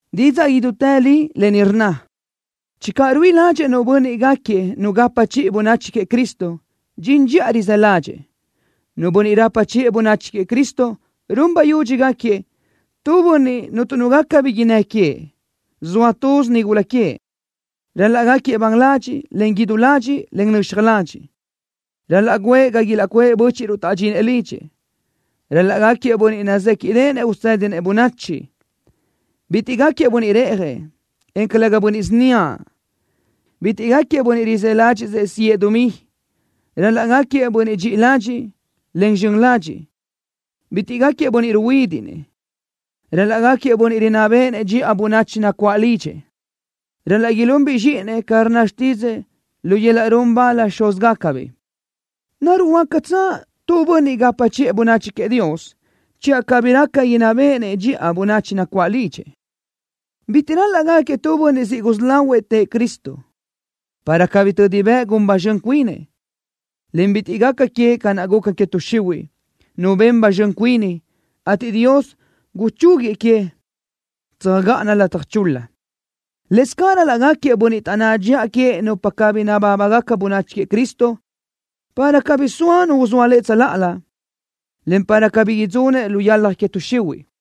Didzaʼ idútë li lë ni rnna: Channö ruíʼi ládxëʼë nu bönniʼ gáquiëʼ nu gapa chiʼi bönachi queëʼ Cristo, dxin dxiʼa rizë́ ládxëʼë. Nu bönniʼ rapa chiʼë bönachi queëʼ Cristo run bayudxi gáquiëʼ: Tu bönniʼ cuntu nu gaca bi innë́ queëʼ. Zoa túzinu nigula queëʼ. Ral-laʼ gáquiëʼ ban ladxiʼ, en idú ladxiʼ, en nöxaj ladxiʼ. Ral-laʼ guʼë ga ilaʼcuʼë bö́chiʼruʼ taʼdxinëʼ lidxëʼ. Ral-laʼ gáquiëʼ bönniʼ nazéquiʼdeʼenëʼ usédinëʼ bönachi. Bitiʼ gáquiëʼ bönniʼ reʼjëʼ, en calëga bönniʼ síniaʼ. Bitiʼ gaquiëʼ bönniʼ rizë́ ládxiʼsëʼ siʼë dumí. Ral-laʼ gáquiëʼ bönniʼ dxiʼi ladxiʼ, en zxön ladxiʼ. Bitiʼ gáquiëʼ bönniʼ ruhuídiʼnëʼ. Ral-laʼ gáquiëʼ bönniʼ rinná béʼenëʼ dxiʼa bönachi nacuáʼ lidxëʼ. Ral-laʼ ilunbiʼ zxíʼinëʼ ca rnna xtídzëʼë lu yöl-laʼ run bal xúzgacabiʼ. ¿Naruʼ huácatsö tu bönniʼ gapa chiʼë bönachi queëʼ Dios channö cabí raca inná béʼenëʼ dxiʼa bönachi nacuáʼ lidxëʼ? Bitiʼ ral-laʼ gáquiëʼ tu bönniʼ siʼ gusí lahuëʼ tëʼë Cristo, para cabí tödi bëʼ gun ba zxön cuinëʼ, en bitiʼ gaca queëʼ ca naʼ guca que tuʼ xihuiʼ, nu ben ba zxön cuini, ateʼ Dios guchúguiëʼ que tsöjgáʼana lataj chul-la. Lëscaʼ ral-laʼ gáquiëʼ bönniʼ taʼnná dxiʼa queëʼ nupa cabí nabábagaca bönachi queëʼ Cristo, para cabí soa nu uzóa lëʼ tsöláʼalö, en para cabí idzunëʼ lu yalaj que tuʼ xihuiʼ.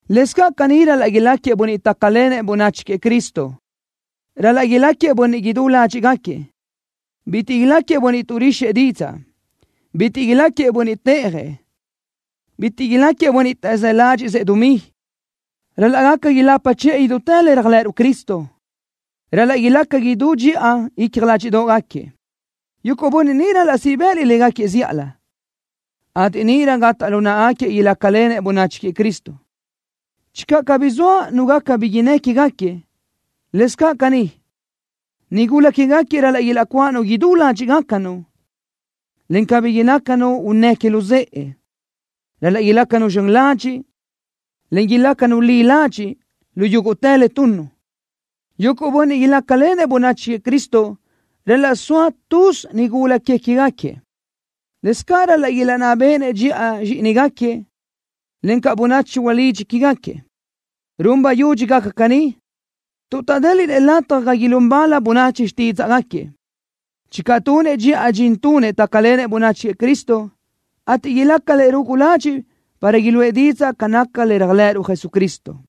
Lëscaʼ caní ral-laʼ iláquiëʼ bönniʼ tácalenëʼ bönachi queëʼ Cristo: Ral-laʼ iláquiëʼ bönniʼ idú ládxiʼgaquiëʼ. Bitiʼ iláquiëʼ bönniʼ tuʼrixëʼ didzaʼ. Bitiʼ iláquiëʼ bönniʼ téʼajëʼ. Bitiʼ iláquiëʼ bönniʼ taʼzë́ ládxiʼsëʼ dumí. Ral-laʼ gaca ilapa chiʼë idútë le réajlëʼëruʼ Cristo. Ral-laʼ ilaca idú dxiʼa icja ládxiʼdoʼgaquiëʼ. Yuguʼ bönniʼ ni ral-laʼ siʼ bë́ʼëliʼ légaquiëʼ zíʼalö, ateʼ níʼirö gataʼ lu náʼagaquiëʼ ilácalenëʼ bönachi queëʼ Cristo, channö cabí zoa nu gaca bi innë́ quégaquiëʼ. Lëscaʼ caní, nigula que queë́gaquiëʼ ral-laʼ ilaʼcuáʼanu idú ládxiʼgacanu, en cabí ilácanu unnë́ que luzë́ʼe. Ral-laʼ ilácanu zxön ladxiʼ, en ilácanu li ladxiʼ lu yúguʼtë le tunnu. Yuguʼ bönniʼ ilácalenëʼ bönachi queëʼ Cristo ral-laʼ soa túzinu nigula que queë́gaquiëʼ. Lëscaʼ ral-laʼ ilaʼnná béʼenëʼ dxiʼa zxíʼinigaquiëʼ, encaʼ bönachi ulidxi que queë́gaquiëʼ. Run bayudxi gaca caní, tuʼ taʼdéliʼnëʼ lataj ga ilún bal bönachi xtídzaʼgaquiëʼ, channö tunëʼ dxiʼa dxin tunëʼ tácalenëʼ bönachi queëʼ Cristo, ateʼ ilácarëʼ rugu ladxiʼ para iluʼë didzaʼ ca naca le réajlëʼëruʼ Jesucristo.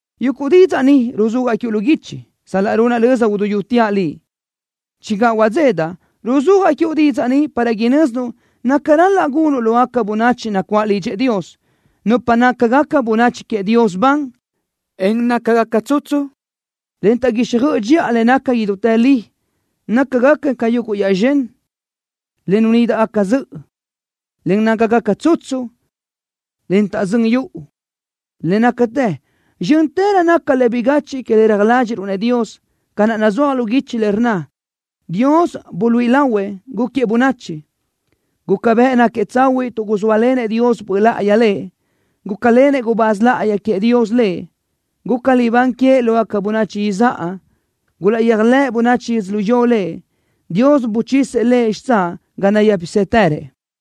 Yuguʼ didzaʼ ni ruzúajaʼ quiuʼ lu guichi, sal-laʼ runaʼ löza uduyúteaʼ liʼ. Channö huadzédaʼ, ruzúajaʼ quiuʼ didzaʼ ni para inö́zinuʼ naca ral-laʼ gunuʼ lógaca bönachi nacuáʼ lidxëʼ Dios, nupa nácagaca bönachi queëʼ Dios ban, en nácagaca tsutsu, en taʼguíxjöʼ dxiʼa le naca idútë li. Nácagaca ca yuguʼ yaʼzxö́n, en le nunídaʼgaca zöʼö, le nácagaca tsutsu, en taʼzö́n yuʼu. Le nácatë, zxö́ntërö naca le bigachiʼ que le reaj ládxiʼruʼ-nëʼ Dios, ca naʼ nazúaj lu guichi le rnna: Dios buluíʼi lahuëʼ, gúquiëʼ bönachi. Guca bëʼ náquiëʼ tsahuiʼ tuʼ guzóalenëʼ Dios Böʼ Láʼayi Lëʼ. Gulácalenëʼ gubáz láʼayi queëʼ Dios Lëʼ. Guca libán queëʼ lógaca bönachi izáʼa. Gulaʼyéajlëʼ bönachi yödzölió Lëʼ. Dios buchisëʼ Lëʼ xitsáʼ ga nayë́pisëtërëʼ.